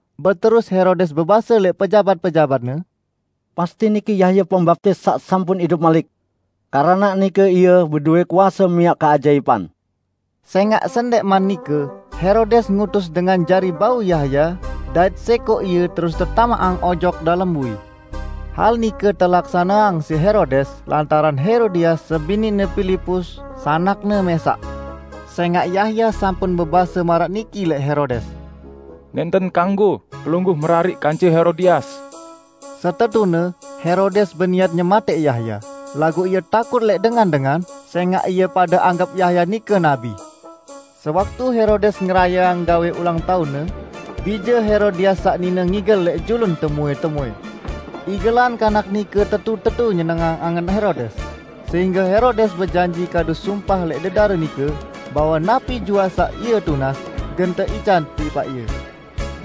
Beterus Herodes bebase lẽq pejabat-pejabatne, "Pasti niki Yahya Pembaptis saq sampun idup malik! Keranaq nike Ie bedowẽ kuase miaq keajaipan." Sẽngaq sendẽqman nike Herodes ngutus dengan jari bau Yahya dait sẽkoq ie terus tetamaqang ojok dalem bui. Hal nike telaksaneang siq Herodes lantaran Herodias sebiniqne Pilipus, sanakne mẽsaq. Sẽngaq Yahya sampun bebase maraq niki lẽq Herodes, "Nẽnten kanggo pelungguh merariq kance Herodias!" Setetune Herodes beniat nyematẽq Yahya, laguq ie takut lẽq dengan-dengan, sẽngaq ie pade anggep Yahya nike nabi. Sewaktu Herodes ngerayeang gawẽ ulang taunne, bije Herodias saq nine ngigel lẽq julun temuẽ-temuẽ. Igelan kanak nike tetu-tetu nyenengang angen Herodes, sehingge Herodes bejanji kadu sumpah lẽq dedare nike, bahwe napi juaq saq ie tunas, gen teican tipaq ie.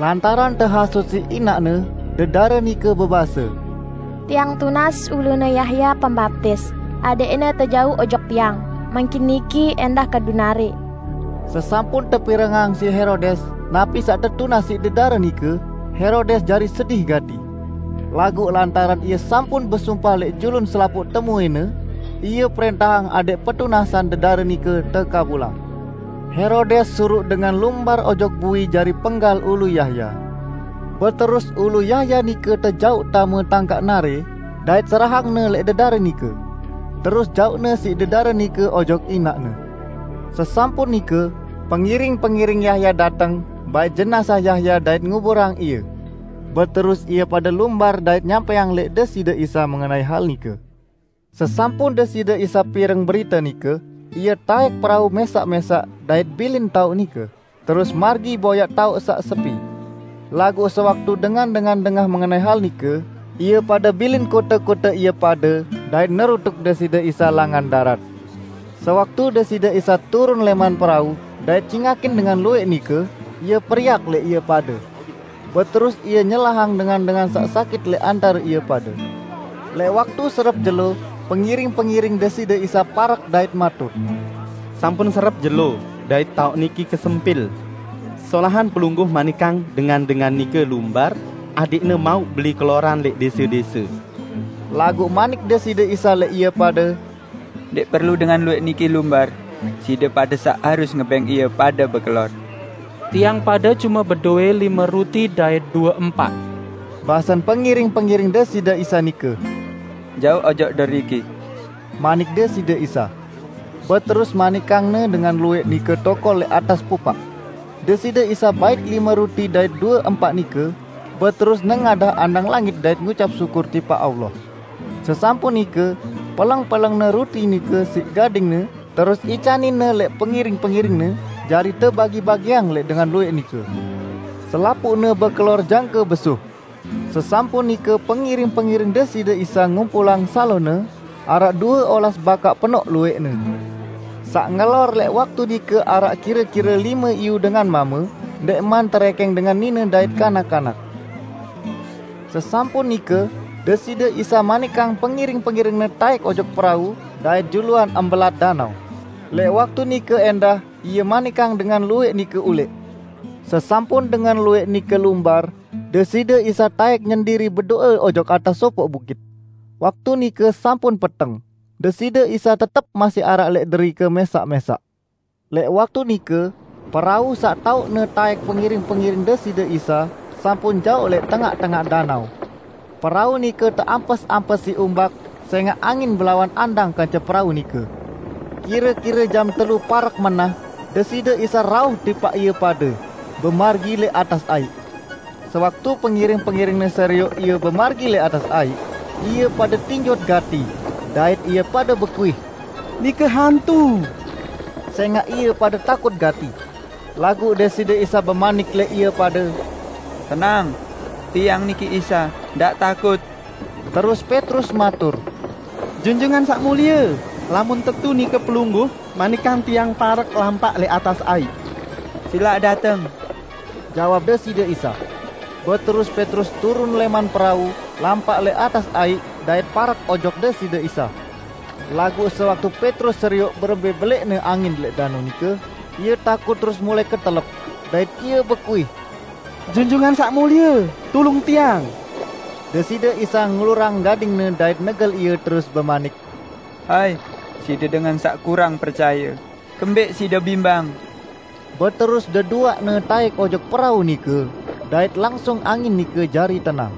Lantaran tehasut siq inaqne, dedare nike bebase, "Tiang tunas ulune Yahya Pembaptis adẽqne tejauq ojok tiang mangkin niki ẽndah kadu narẽ!" Sesampun tepirengang siq Herodes napi saq tetunas siq dedare nike, Herodes jari sedih gati. Laguq lantaran ie sampun besumpah lẽq julun selapuq temuẽne, ie prẽntahang adẽq petunasan dedare nike tekabulang. Herodes suruq dengan lumbar ojok bui jari penggal ulu Yahya. Beterus ulu Yahya nike tejauq tame tangkaq narẽ, dait serahangne lẽq dedare nike. Terus jauqne siq dedare nike ojok inaqne. Sesampun nike, pengiring-pengiring Yahya dateng bait jenazah Yahya dait nguburang ie. Beterus ie pade lumbar dait nyampẽang lẽq Deside Isa mengenai hal nike. Sesampun Deside Isa pireng berite nike, Ie taẽk perau mẽsaq-mẽsaq dait bilin taoq nike, terus margi boyaq taoq saq sepi. Laguq sewaktu dengan-dengan dengah mengenai hal nike, ie pade bilin kote-kote ie pade dait nerutuk Deside Isa langan darat. Sewaktu Deside Isa turun lẽman perau dait cingakin dengan luwẽq nike, Ie periak lẽq ie pade. Beterus Ie nyelahang dengan-dengan saq sakit lẽq antare ie pade. Lẽq waktu serep jelo, pengiring-pengiring Deside Isa parek dait matur, "Sampun serep jelo, dait taoq niki kesempil. Solahan Pelungguh manikang dengan-dengan nike lumbar, adẽqne mauq beli keloran lẽq dẽse-dẽse." Laguq manik Deside Isa lẽq ie pade, "Ndẽq perlu dengan luwẽq niki lumbar, side pade saq harus ngebẽng ie pade bekelor." "Tiang pade cume bedowẽ lime ruti dait due empaq!" basen pengiring-pengiring Deside Isa nike. "Jauq ojok deriki," manik Deside Isa. Beterus manikang-Ne dengan luwẽq nike tokol lẽq atas pupaq. Deside Isa bait lime ruti dait due empaq nike, beterus nengadah andang langit dait ngucap syukur tipaq Allah. Sesampun nike peleng-peleng-Ne ruti nike siq gading-Ne terus icanin-Ne lẽq pengiring-pengiring-Ne jari tebagi-bagiang lẽq dengan luwẽq nike. Selapuqne bekelor jangke besuh, sesampun nike pengiring-pengiring Deside Isa ngumpulang salone, araq due olas bakaq penoq luwẽqne. Saq ngelor lẽq waktu nike araq kire-kire lime iyu dengan mame, ndẽqman terẽkẽng dengan nine dait kanak-kanak. Sesampun nike, Deside Isa manikang pengiring-pengiring-Ne taẽk ojok perau dait juluan mbelat danao, lẽq waktu nike ẽndah Ie manikang dengan luwẽq nike ulẽq. Sesampun dengan luwẽq nike lumbar, Deside Isa taẽk nyendiri bedo'e ojok atas sopoq bukit. Waktu nike sampun peteng, Deside Isa tetep masih araq lẽq derike mẽsaq-mẽsaq. Lẽq waktu nike, perau saq taoqne taẽk pengiring-pengiring Deside Isa sampun jaoq lẽq tengaq-tengaq danao. Perau nike teampes-ampes siq umbak sẽngaq angin belawan andang kance perau nike. Kire-kire jam telu parek menah, Deside Isa rauh tipaq ie pade, bemargi lẽq atas aiq. Sewaktu pengiring-pengiring-Ne serioq Ie bemargi lẽq atas aiq, ie pade tinjot gati terus ie pade bekuih, "Nike hantu!" sẽngaq ie pade takut gati. Laguq Deside Isa bemanik lẽq ie pade, "Tenang! Tiang niki Isa, ndaq takut!" Terus Petrus matur, "Junjungan Saq Mulie, lamun tetu nike Pelungguh, manikang tiang parek lampaq lẽq atas aiq." "Silaq dateng," jawab Deside Isa. Beterus Petrus turun lẽman perau, lampaq lẽq atas aiq dait parek ojok Deside Isa. Laguq sewaktu Petrus serioq berembẽ belẽqne angin lẽq danao nike, ie takut terus mulai ketelep, dait ie bekuih, "Junjungan Saq Mulie, tulung tiang!" Deside Isa ngulurang gading-Ne dait negel ie terus bemanik, "Hai, side dengan saq kurang percaye, kembẽq side bimbang?" Beterus deduaqne taẽk ojok perau nike, dait langsung angin nike jari tenang.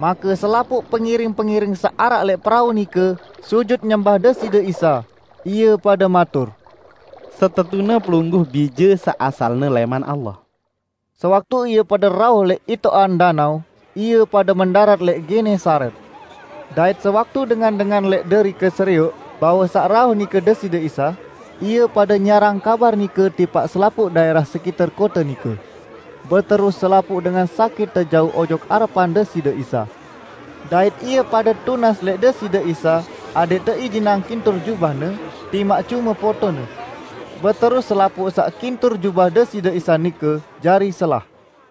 Make selapuq pengiring-pengiring saq araq lẽq perau nike sujut nyembah Deside Isa. Ie pade matur, "Setetune Pelungguh Bije saq asalne lẽman Allah!" Sewaktu ie pade rauh lẽq itoqan danao, ie pade mendarat lẽq Genesaret. Dait sewaktu dengan-dengan lẽq derike serioq bahwe saq rauh nike Deside Isa, ie pade nyiarang kabar nike tipaq selapuq daẽrah sekiter kote nike. Beterus selapuq dengan sakit tejauq ojok arepan Deside Isa. Dait ie pade tunas lẽq Deside Isa adẽq teijinang kintur jubah-Ne, timaq cume potone. Beterus selapuq saq kintur jubah Deside Isa nike jari selah.